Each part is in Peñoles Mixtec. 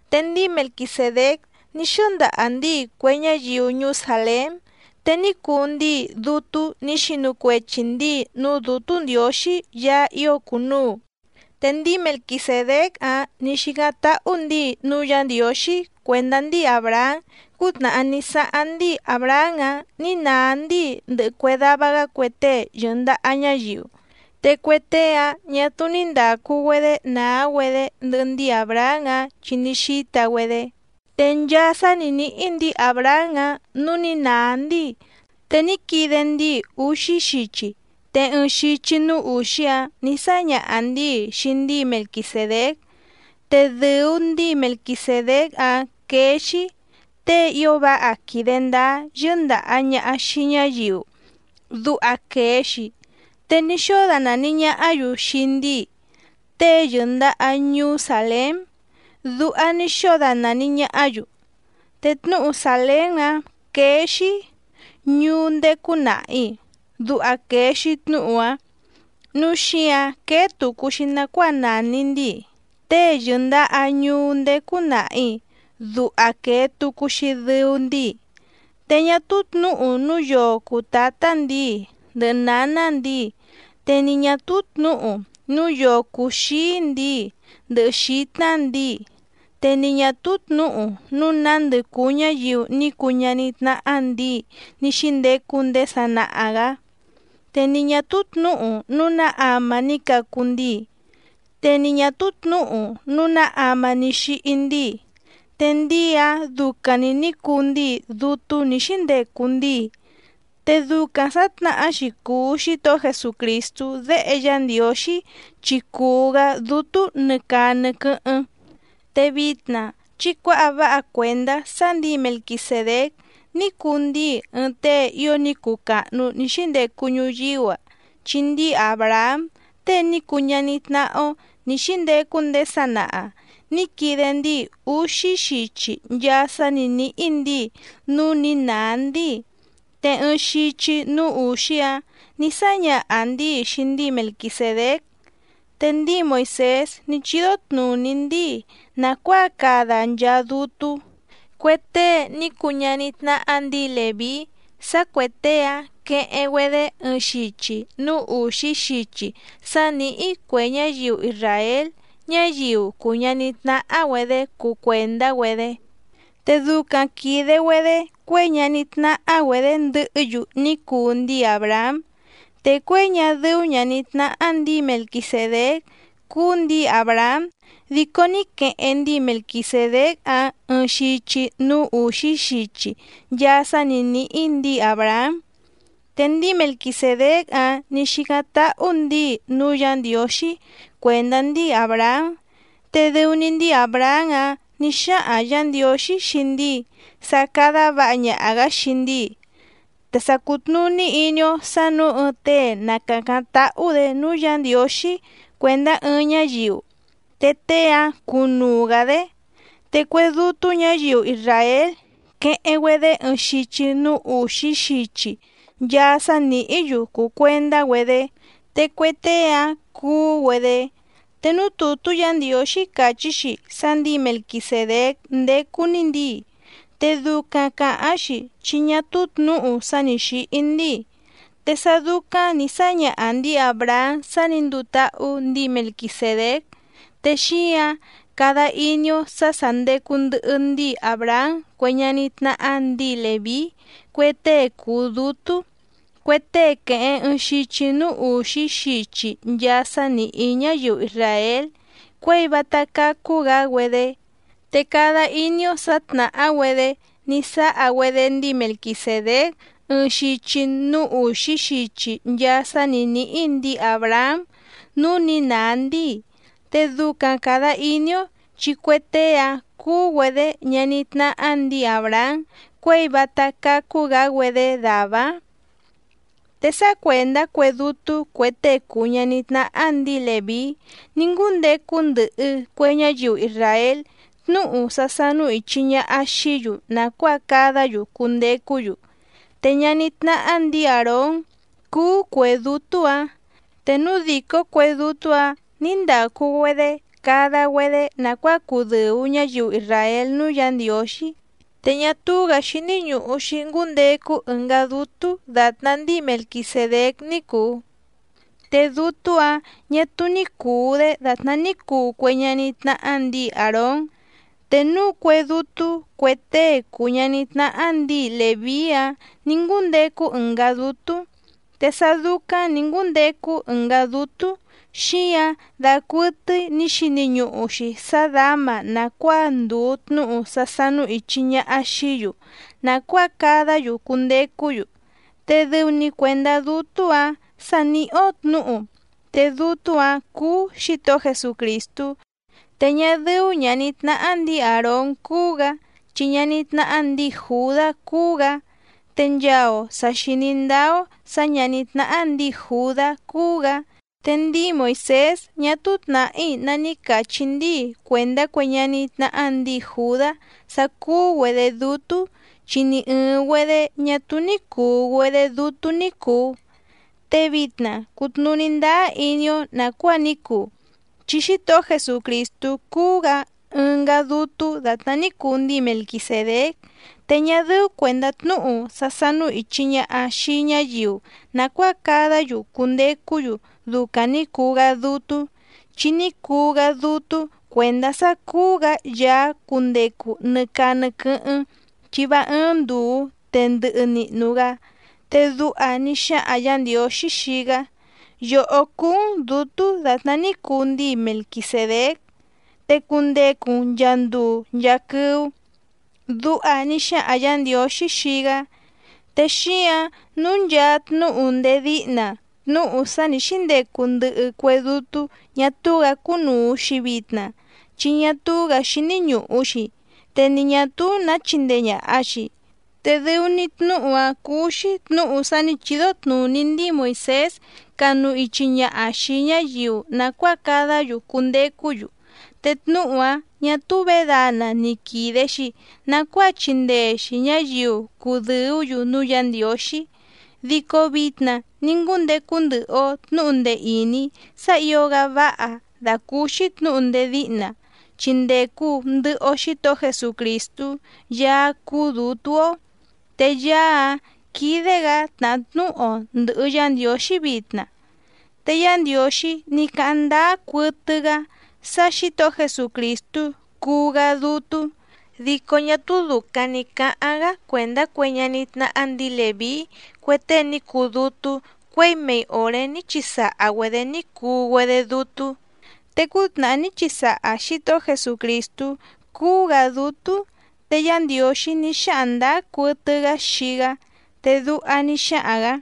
Te ndíi Melquisèdéc ní xɨ́ndaha ndíi cue ñáyiu ñuú Sàlém, te ní cuu ndíi dútú nǐ xinu cuechi ndǐi núú Dǔtú Ndiǒxí Yaá ío cùnuu. Te ndíi Melquisèdéc‑áⁿ nǐ xícáⁿ táhú ndǐi núú Yǎ Ndiǒxí cuèndá ndíi Àbrahám cútnàhá ní sáháⁿ ndíi Àbrahám‑áⁿ nǐ nàá ndíi ndɨhɨ cue dava‑gá cue tée yɨ̀ndaha ñáyiu. Te cue tée‑áⁿ ñà túú ní ndàcu‑güedé nàá‑güedé ndɨhɨ ndíi Àbrahám‑áⁿ chi ní xíta‑güedé. Te nchaa sá nǐ níhí ndǐi Àbrahám‑áⁿ nǔú nǐ nàá ndíi, te ní quide ndíi úxí xichi te ɨɨⁿ xichi núú ùxí‑áⁿ nǐ sáñaha ndǐi xii ndíi Melquisèdéc. Te dɨ̀u ndíi Melquisèdéc‑áⁿ quéé‑xí: Tée ío váha quìde ndáá yɨ́ndàha ñaha xii ñáyiu, duha quèe‑xi. Te ní xóo danàni ñahá‑yu xii ndíi Tée yɨ̀ndaha ñuú Sàlém, duha ní xóo danàni ñahá‑yu. Te tnúhu Sàlém‑áⁿ quéé‑xí: Ñuú ndécú nàhi, duha quèe‑xi tnúhu‑áⁿ. Núu xíǎⁿ quéé tùcu‑xi nacuáa nàni ndíi Tée yɨ̀ndaha ñuú ndécú nàhi, duha quèe tucu‑xi dɨu ndíi. Te ñá túú tnǔhu núu yoo cùu tátá ndǐi ndɨhɨ nǎná ndǐi, te ni ñà túú tnǔhu núu yoo cùu xíí ndǐi ndɨhɨ xǐtná ndǐi, te ni ñà túú tnǔhu núu nándɨ cùu ñáyiu ní cuu ñaní tnáhá ndǐi ní xíndecu ndéé sanaha‑gǎ, te ni ñà túú tnǔhu núu ná ama ní cacu ndíi, te ni ñà túú tnǔhu núu ná ama ní xíhí ndíi. Te ndíi‑áⁿ ducaⁿ‑ni nǐ cuu ndíi dútú nǐ xíndecu ndíi, te ducaⁿ sǎtnahá‑xi cùu Xítohó Jesucrìstú déhe Yá Ndiǒxí chi cuu‑gá dútú nɨ caa nɨ quɨ́hɨ́ⁿ. Te vitna chí cuǎha váha cuèndá sá ndǐi Melquisèdéc ní cuu ndíi ɨɨⁿ tée ío ní cuu càhnu ní xíndecu ñuyíú‑a, chi ndíi Àbrahám tée ní cuu ñaní tnáhá‑ó nǐ xíndecu ndéé sanaha nǐ quide ndíi úxí xichi nchaa sá nǐ níhí ndǐi núú nǐ nàá ndíi. Te ɨɨⁿ xichi núú ùxí‑áⁿ nǐ sáñaha ndǐi xii ndíi Melquisèdéc. Te ndíi Moìsés ní chídó tnùní ndíi nàcuáa cada nchaa dútú, cue tée ní cuu ñaní tnáhá ndǐi Lèví sá cuè tée‑áⁿ queheⁿ‑güedé ɨɨⁿ xichi núú ùxí xichi sá nìhí cue ñáyiu isràél ñáyiu cùu ñaní tnáhá‑güedě cuu cuèndá‑güedé. Te ducaⁿ quìde‑güedé cuěi ñaní tnáhá‑güedě ndɨhɨ́‑yu ní cuu ndíi Àbrahám. Te cuěi ñá dɨ́ú ñàní tnáhá ndǐi Melquisèdéc cúú ndǐi Àbrahám dico ní queheⁿ ndíi Melquisèdéc‑áⁿ ɨɨⁿ xichi núú ùxí xichi nchaa sá nǐ níhí ndǐi Àbrahám. Te ndíi Melquisèdéc‑áⁿ nǐ xícáⁿ táhú ndǐi núú Yǎ Ndiǒxí cuèndá ndíi Àbrahám. Te dɨu‑ni ndíi Àbrahám‑áⁿ nǐ xáhaⁿ Yǎ Ndiǒxí xii ndíi sá cádá vǎha ñaha‑gǎ xii ndíi. Te sa cùtnuní iní‑ó sǎ nǔu ɨɨⁿ tée na càcáⁿ táhú‑dě núú Yǎ Ndiǒxí cuèndá ɨɨⁿ ñáyiu, te tée‑áⁿ cúnùu‑gá‑dé. Te cue dútú ñǎyiu isràél quéhéⁿ‑güedě ɨɨⁿ xichi núú ùxí xichi nchaa sá nìhí‑yu cùu cuendá‑güedé, te cue tée‑áⁿ cuú‑güedé. Te núú tùtú Yǎ Ndiǒxí càchí‑xi sá ndǐi Melquisèdéc ndécú‑ní ndǐi, te ducaⁿ càháⁿ‑xi chi ñá túú tnǔhu sá nǐ xíhí ndíi. Te sá dúcáⁿ nǐ sáñaha ndǐi Àbrahám sá nǐ nduu táhú ndǐi Melquisèdéc, te xíǎⁿ cada iní‑ó sǎ sà ndecu ndɨhɨ ndíi Àbrahám cue ñaní tnáhá ndǐi Lèví cue tée cùu dútú, cue tée quèheⁿ ɨɨⁿ xichi núú ùxí xichi nchaa sá nìhí ñáyiu isràél cuěi vátá cácú‑gǎ‑güedé. Te cada iní‑ó sǎ tnàhá‑güedé ní sáha‑güedé ndíi Melquisèdéc ɨɨⁿ xichi núú ùxí xichi nchaa sá nǐ níhí ndǐi Àbrahám núú nǐ nàá ndíi. Te ducaⁿ càda iní‑ó chi cue tée‑áⁿ cúú‑güedě ñaní tnáhá ndǐi Àbrahám cuěi vátá cácú‑gǎ‑güedé dàvá‑áⁿ. Te sá cuèndá cue dútú cue tée cùu ñaní tnáhá ndǐi Lèví ní ngúndecu ndɨhɨ cue ñáyiu isràél tnúhu sá sánú ìchi ñaha xií‑yu nàcuáa cadá‑yu cundecú‑yu. Te ñaní tnáhá ndǐi Àrón cúú cuè dútú‑ǎⁿ. Te núu dìcó cue dútú‑ǎⁿ ní ndàcu‑güedé cada‑güedé nàcuáa cudɨ̀u ñáyiu isràél núú Yǎ Ndiǒxí, te ñá túú‑gǎ xíní ñùhu‑xi ngúndecu ɨngá dútú dàtná ndíi Melquisèdéc ní cùu. Te dútú‑ǎⁿ ñà túú ní cùu‑dé dàtná ní cuu cue ñaní tnáhá ndǐi Àrón. Te núú cuè dútú cue tée cùu ñaní tnáhá ndǐi Lèví‑áⁿ nǐ ngúndecu ɨngá dútú. Te sá dúcáⁿ nǐ ngúndecu ɨngá dútú xíǎⁿ dacuɨtɨ́í nǐ xini ñuhu‑xi sá dǎma nàcuáa ndùu tnúhu sá sánú ìchi ñaha xií‑yu nàcuáa cadá‑yu cundecú‑yu. Te dɨu‑ni cuèndá dútú‑ǎⁿ sa nìhí‑ó tnǔhu, te dútú‑ǎⁿ cúú Xǐtohó Jesucrìstú, te ñá dɨ́ú ñàní tnáhá ndǐi Àrón cúú‑gǎ chi ñaní tnáhá ndǐi Jùdá cúú‑gǎ. Te nchaa‑o tà xiní ndáá‑ó sǎ ñàní tnáhá ndǐi Jùdá cúú‑gǎ, te ndíi Moìsés ñá túú tnàhí ná ní càchí ndíi cuèndá cue ñaní tnáhá ndǐi Jùdá sá cúú‑güedě dútú, chi ni ɨ̀ɨⁿ‑güedé ñá túú ní cùu‑güedé dútú ní cùu. Te vitna cùtnuní ndáá iní‑ó nàcuáa ní cuu, chi Xítohó Jesucrìstú cúú‑gǎ ɨngá dútú dàtná ní cuu ndíi Melquisèdéc. Te ñá dɨ́ú cuèndá tnúhu sá sánú ìchi ñaha xii ñáyiu nàcuáa cadá‑yu cundecú‑yu ducaⁿ ni cùu‑gá dútú, chi ní cuu‑gá dútú cuèndá sá cúú‑gǎ Yaá cundecu nɨ caa nɨ quɨ́hɨ́ⁿ chi vá ɨ́ɨ́ⁿ ndùu te ndɨhɨ nihnu‑gá. Te duha ní xáhaⁿ Yǎ Ndiǒxí xii‑gá: Yòhó cúú‑n dǔtú dàtná ní cuu ndíi Melquisèdéc, te cundecu‑n nchàa nduu nchaa quɨ́ú. Duha ní xáhaⁿ Yǎ Ndiǒxí xii‑gá. Te xíǎⁿ nǔu nchaa tnúhu ndéé díhna, tnúhu sá nǐ xíndecu ndɨhɨ cue dútú ñà túú‑gǎ cúnùu‑xi vitna chi ñá túú‑gǎ xíní ñùhu‑xi te ni ñà túú nǎ chíndèe ñaha‑xi. Te dɨu‑ni tnúhu‑áⁿ cúú‑xí tnǔhu sá nǐ chídó tnùní ndíi Moìsés canu ichi ñaha xìi ñáyiu nàcuáa cadá‑yu cundecú‑yu. Te tnúhu‑áⁿ ñà túú vědana ni quìde‑xi nacuáa chindee‑xi ñǎyiu cudɨ̀ú‑yu núú Yǎ Ndiǒxí. Dico vitna ní ngúndecu ndɨhɨ‑o tnǔhu ndee ìní sá ǐo‑gá váha dàcúúxí tnǔhu ndéé díhna, chi ndècu ndɨhɨ‑o Xítohó Jesucrìstú Yaá cúú dǔtú‑ó. Te Yaá‑áⁿ quídé‑gǎ tnàhá tnúhu‑o ndɨ̀hɨ Yá Ndiǒxí vitna. Te Yá Ndiǒxí ní cáháⁿ ndáá cuɨtɨ‑gá sá Xǐtohó Jesucrìstú cuu‑gá dútú. Dico ñá túú dùcaⁿ ní cáháⁿ‑gá cuèndá cue ñaní tnáhá ndǐi Lèví cue tée ní cuu dútú, cuěi mei òré ní chisaha‑güedě ní cuu‑güedé dútú. Te cútnàhá ní chisaha Xǐtohó Jesucrìstú cúú‑gǎ dútú, te Yá Ndiǒxí ní xáhaⁿ ndǎá cuɨtɨ‑gá xii‑gá, te duha ní xáhaⁿ‑gǎ: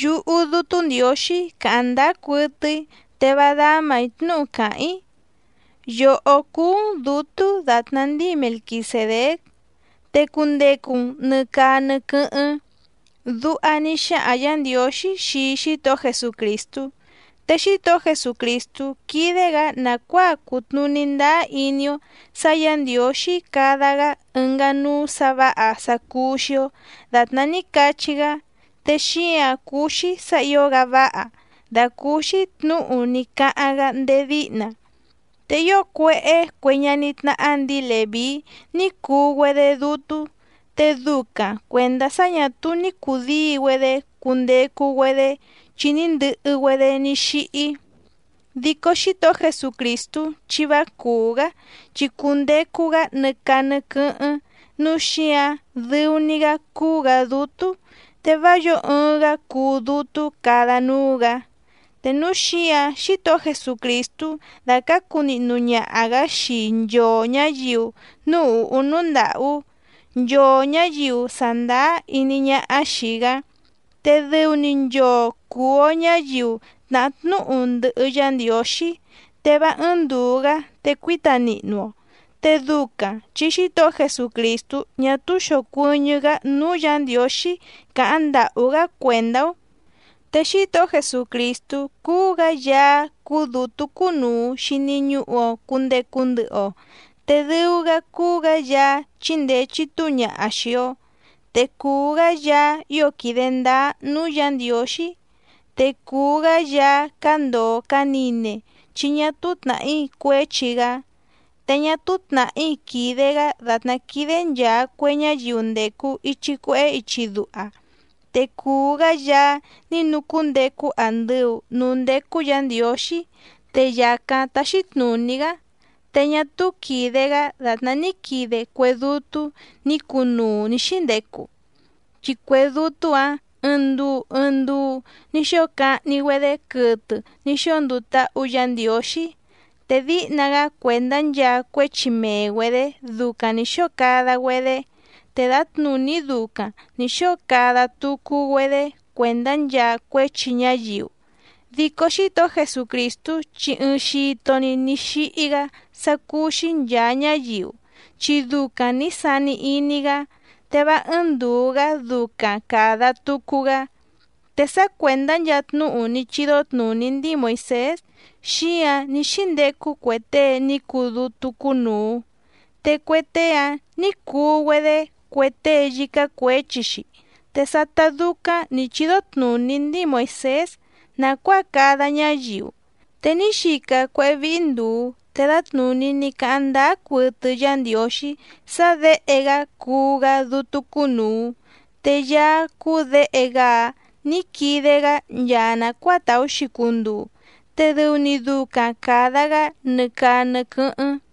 Yúhú Dútú Ndiǒxí càháⁿ ndáá cuɨtɨ‑í te vá dámà‑í tnúhu càháⁿ‑í: “Yòhó cúú‑n dǔtú dàtná ndíi Melquisèdéc, te cundecu‑n nɨ̀ caa nɨ quɨ́hɨ́ⁿ.” Duha ní xáhaⁿ Yǎ Ndiǒxí xii Xítohó Jesucrìstú. Te Xítohó Jesucrìstú quídé‑gǎ nàcuáa cutnùní ndáá iní‑ó sǎ Yǎ Ndiǒxí cada‑gá ɨngá núú sǎ vǎha sá cúú‑xí‑ó dàtná ní cachí‑gá, te xíǎⁿ cúú‑xí sǎ ǐo‑gá váha dàcúúxí tnǔhu ní cáháⁿ‑gá ndéé díhna. Te ío cuéhé cue ñaní tnáhá ndǐi Lèví ní cuu‑güedé dútú, te ducaⁿ cuèndá sá ñà túú ní cùdíi‑güedé cundecu‑güedé chi ní ndɨhɨ‑güedé ní xíhí. Dico Xítohó Jesucrìstú chi vá cùú‑gá, chi cundecu‑gá nɨ caa nɨ quɨ́hɨ́ⁿ nǔu xíǎⁿ dɨu‑ni‑gá cuu‑gá dútú, te vá yǒo ɨɨⁿ‑gá cuu dútú cada núú‑gǎ. Te núu xíǎⁿ Xítohó Jesucrìstú dácǎcu nihnu ñaha‑gǎ xii nchoo ñǎyiu núú ùhú núú ndàhú, nchoo ñǎyiu sàndáá iní ñáhá xìi‑gá, te dɨu‑ni nchoo cùu‑o ñáyiu tnàhá tnúhu ndɨhɨ Yá Ndiǒxí, te vá ɨ́ɨ́ⁿ ndùu‑gá te cuíta nihnu‑o. Te ducaⁿ chi Xítohó Jesucrìstú ñá túú xòcuɨñɨ́‑gá núú Yǎ Ndiǒxí càháⁿ ndàhú‑gá cuèndá‑ó. Te Xítohó Jesucrìstú cúú‑gǎ Yaá cúú dǔtú cúnùu xini ñuhu‑o cundecu ndɨhɨ‑o, te dɨu‑gá cúú‑gǎ Yaá chíndèe chitúu ñaha xii‑o, te cùu‑gá Yaá ío quìde ndáá núú Yǎ Ndiǒxí, te cùu‑gá Yaá cándòo canine chi ñá túú tnàhí cuéchi‑gá. Te ñá túú tnàhí quìde‑gá dàtná quídé nchàa cue ñáyiu ndècu ichi cuehé ichi duha, te cùu‑gá Yaá ní nucúndecu andɨu nǔú ndécú Yǎ Ndiǒxí te yàcáⁿ táxí tnùní‑gá. Te ñá túú quìde‑gá dàtná ní quide cue dútú nǐ cunuu nǐ xíndecu, chi cue dútú‑ǎⁿ ɨɨⁿ nduu ɨɨⁿ nduu ní xóo cahni‑güedé quɨtɨ ní xóo nduu táhú Yǎ Ndiǒxí, te díhna‑gá cuèndá nchaa cuéchi mee‑güedě ducaⁿ nǐ xóo cada‑güedé te dǎtnùní ducaⁿ nǐ xóo cada tucu‑güedé cuèndá nchaa cuéchi ñáyiu. Dico Xítohó Jesucrìstú chi ɨɨⁿ xito‑ni ní xíhí‑gá sá cúú‑xí nchàa ñáyiu chi ducaⁿ nǐ sani iní‑gá, te vá ɨ́ɨ́ⁿ ndùu‑gá ducaⁿ càda tucu‑gá. Te sá cuèndá nchaa tnúhu ní chídó tnùní ndíi Moìsés xíǎⁿ ní xíndecu cue tée ní cuu dútú cúnùu, te cue tée‑áⁿ nǐ cuu‑güedé cue tée yícá cuěchi‑xi. Te sátá dúcáⁿ nǐ chídó tnùní ndíi Moìsés nàcuáa cada ñáyiu, te ní xica cuéhé víhí ndùu te dǎtnùní ní cáháⁿ ndáá cuɨtɨ Yá Ndiǒxí sá Děhe‑gá cuu‑gá dútú cúnùu. Te Yaá cúú Děhe‑gá‑áⁿ nǐ quide‑gá nchaa nàcuáa tàú‑xi cunduu, te dɨu‑ni ducaⁿ càda‑gá nɨ caa nɨ quɨ́hɨ́ⁿ.